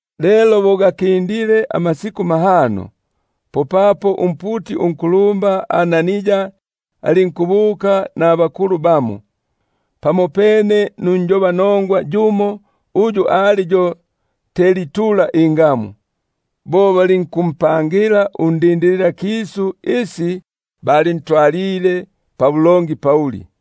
Lelo bo gakindile amasiku mahano, popapo umputi unkulumba Anania alinkubuka nabakulu bamo, pamopene nunjobanongwa yumo uyu ali yo Tertuli ingamu; bo balinkumpangila undindililakisu isi bandongaga Pauli.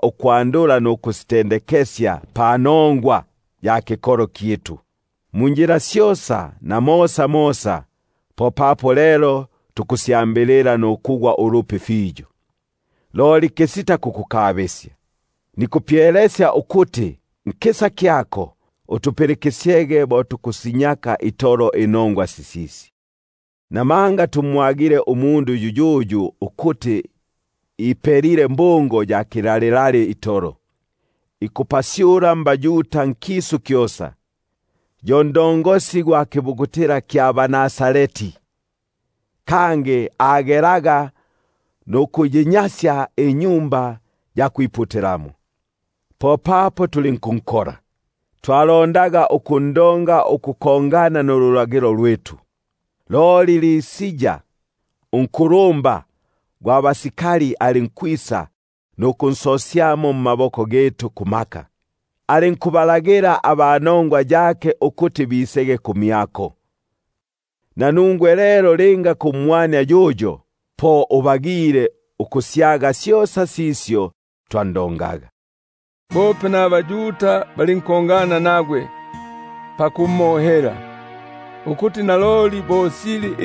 ukyandwile ikikolo iki, munjila syosa na mosamosa, popapo lelo tukusyambilila nukugwa ulupi fiyo. Loli kisita kukukabisya, nikupyelesya ukuti nkisa kyako utupilikisyege bo tukusinyaka itolo inongwa sisisi. Namanga tumwagile umundu yuyuyu ukuti ipelile mhungo ya kilalilali itolo, ikupalisya akapasyu mbaYuda nkisu kyosa; yo ntu gwa kapanga ka baNazareti. Kangi agelaga nukunnyasya Tempeli; popapo tulinkunkola. [Twalondaga ukundonga ukukongana nululagilo lwitu, loli Lisia unkulumba gwa basikali alinkwisa nukunsosyamo mmaboko gitu kumaka, alinkubalagila aba nongwa yake ukuti bisege kumyako.] Nanungwe lelo linga kumwania yuyo, po ubagile ukusyaga syosa sisyo twando- ngaga. Bope nabaYuda balinkongana nagwe pakumohela, ukuti naloli bo sili.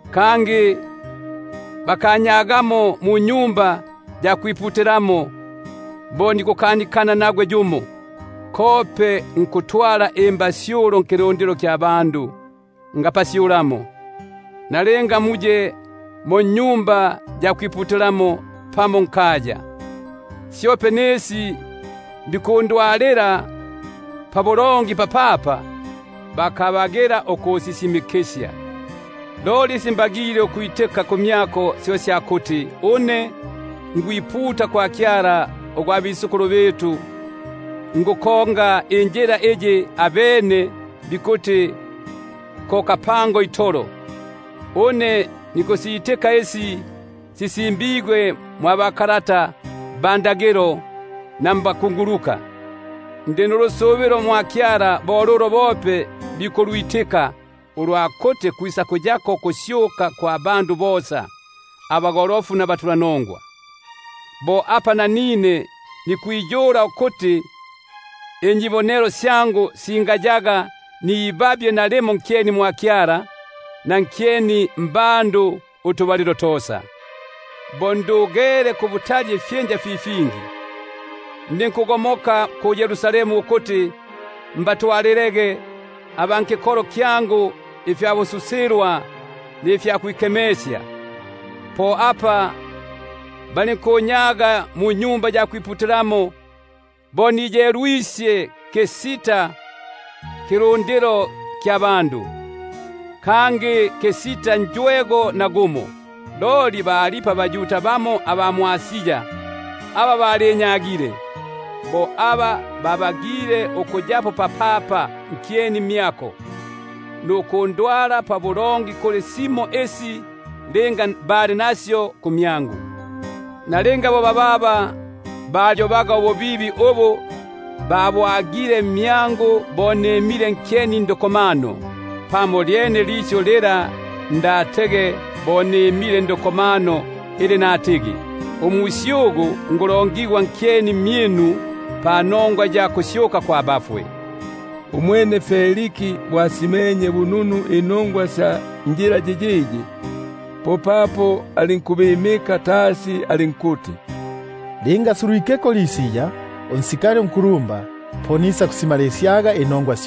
Kangi bakanyagamo mwa Tempeli bo nikukanikana nagwe yumo, kope nukupalisya akapasyu nkilundilo ngapalisyamo, nalinga muye mo mu-Sinagogi pamo nkaya; syope nisi bikunyohela papapa, bakabagila ikusisisimikisya. Loli syo mbagile ukwitika kumyako, isya kuti ngubombela mwa Kyala gwa batata munjila iyi bikuti ko kapanga itolo, une nkusitka isi sisimbigwe ndulagilo na nabakunguluka. Ndi nulusubilo mwa Kyala, bo lulo bope bikulwitka, ulwa kuti kwisakuyako ukusyuka kwa bagolofu nabaniongafu. Po apa nanine nikwiyula ukuti inyibonelo syangu singayaga nibabye nalimo nkyeni mwa Kyala, na nkyeni mbandu utubalilo tosa. Bo Akindilepo ifyinja fi fingi, nalisile nukubatwalila aba kikolo kyangu ifyabu- susilwa nifyakwikemekesya; po apa balinkunyaga mwa Tempeli bo niyelwisye kisita kilundilo, kangi kisita njwego. Loli balipo bamo abaYuda aba mwʼAsia aba balinyagile, bo aba babagile ukuyapo papapa nkyeni mmyako, nukundonga simo isi linga bali nasyo kumyangu. Nalinga bo bababa, balibuyobaga ububibi ubu babwagile mmyangu bo nimile nkyeni ndukomano; pamo lyene li lisyu lila ndatege bo nimile ndukomano ili natigi: Umusyugu ngulongigwa nkyeni mmyinu panongwa ya kusyuka abafwe. Umwene Feliki bo asimenye bununu inongwa sya njila yiyiyi, popapo alinkubimka tasi alinkuti: Linga asulwikeko Lisia, unkulumba gwa baskali, po nisakutumulaga inongwa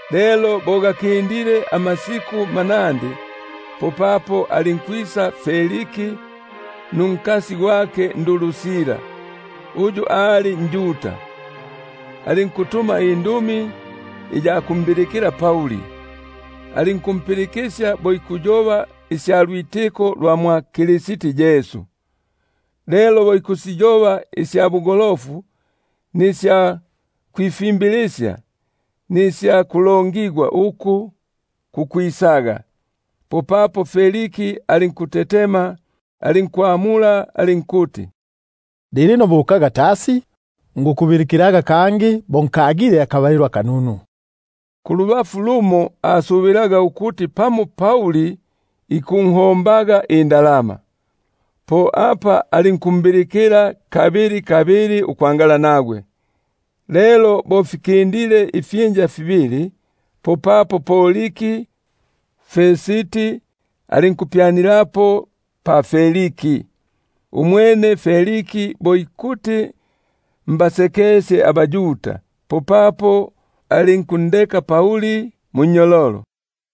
Lelo bo gakindilepo amasku manandi, popapo alinkwisa Feliki nunkasi gwake Drusila, uyu ali njuda, alinkutuma indumi iya kumbilikila Pauli, alinkumpilikisya bo ikuyoba isya lwitiko lwa mwa Kristi Yesu. Lelo bo ikusiyoba isya bugolofu, nisya kwifimbilisya, nisya kulongigwa uku kukwisaga, popapo Feliki alinkutetema, alinkwamula alinkuti: Lilino bukaga tasi, nikukubilikilaga kangi bo nkagile akabalilo akanunu; kulubafu lumo asubilaga ukuti pamo Pauli ikunhombaga indalama. Po apa ambilikilaga kabili kabili ukwangala nagwe. Lelo bo Akindilepo ifyinja fibili, popapo Poriki Festi alinkupyanilapo pa Feliki. Umwene Feliki bo ikuti mbasekesye abaYuda, popapo alinkundeka Pauli munnyololo.